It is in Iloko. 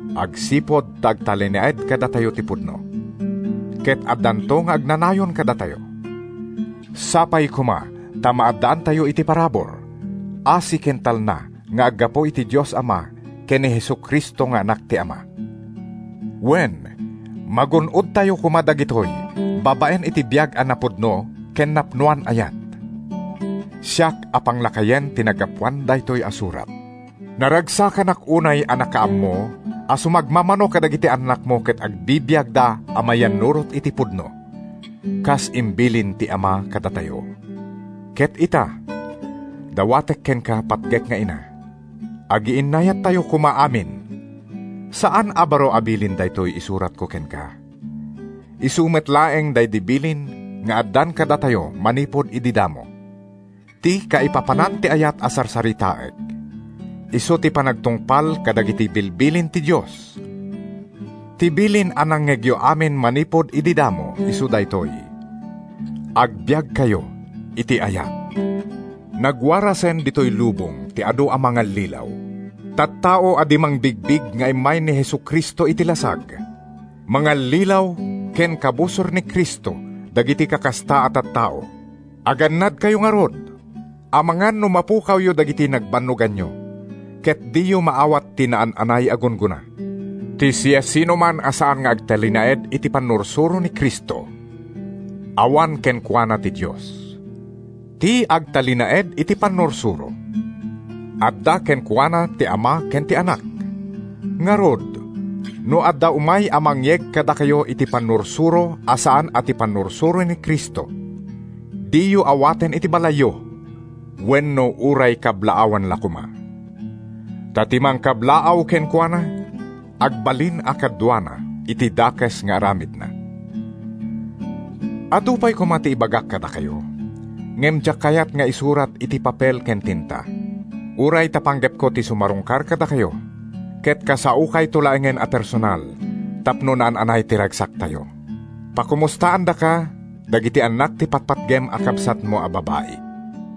agsipud ta agtalinaed kadatayo ti pudno, ket addanto nga agnanayon kadatayo. Sapay koma ta maaddaantayo iti parabur, asi ken talna nga aggapu iti Dios Ama ken ni Jesu-Cristo nga Anak ti Ama. Wen, magun-odtayo koma dagitoy babaen iti biag a napudno ken napnoan ayat. Siak a Panglakayen ti naggapuan daytoy a surat. Naragsakanak unay a nakaammo a sumagmamano kadagiti annakmo ket agbibiagda a mayannurot iti pudno, kas imbilin ti Ama kadatayo. Ket ita, dawatek kenka, patgek nga Ina: agiinnayattayo koma amin. Saan a baro a bilin daytoy isuratko kenka—isu met laeng daydi bilin nga addan kadatayo manipud idi damo. Ti kaipapanan ti ayat a sarsaritaek isu ti panagtungpal kadagiti bilbilin ti Dios. Ti bilin a nangngegyo amin manipud idi damo isu daytoy: Agbiagkayo iti ayat. Nagwarasen ditoy lubong ti adu a mangallilaw, tattao a di mangbigbig nga immay ni Jesu-Cristo iti lasag. Mangallilaw ken Kabusor ni Cristo dagiti kakasta a tattao. Agannadkayo ngarud, amangan no mapukawyo dagiti nagbannoganyo ket diyo maawat ti naan-anay a gunggona. Ti siasinoman a saan nga agtalinaed iti pannursuro ni Cristo, awan kenkuana ti Dios. Ti agtalinaed iti pannursuro, adda kenkuana ti Ama ken ti Anak. Ngarud, no adda umay a mangyeg kadakayo iti pannursuro a saan a ti pannursuro ni Cristo, diyo awaten iti balayyo, wenno uray kablaawan la koma. Ta ti mangkablaaw kenkuana, agbalin a kaduana iti dakes nga aramidna. Adu pay koma ti ibagak kadakayo, ngem diak kayat nga isurat iti papel ken tinta. Uray ta panggepko ti sumarungkar kadakayo ket kasaokayto laengen a personal tapno naan-anay ti ragsaktayo. Pakomustaandaka dagiti annak ti patpatgem a kabsatmo a babai.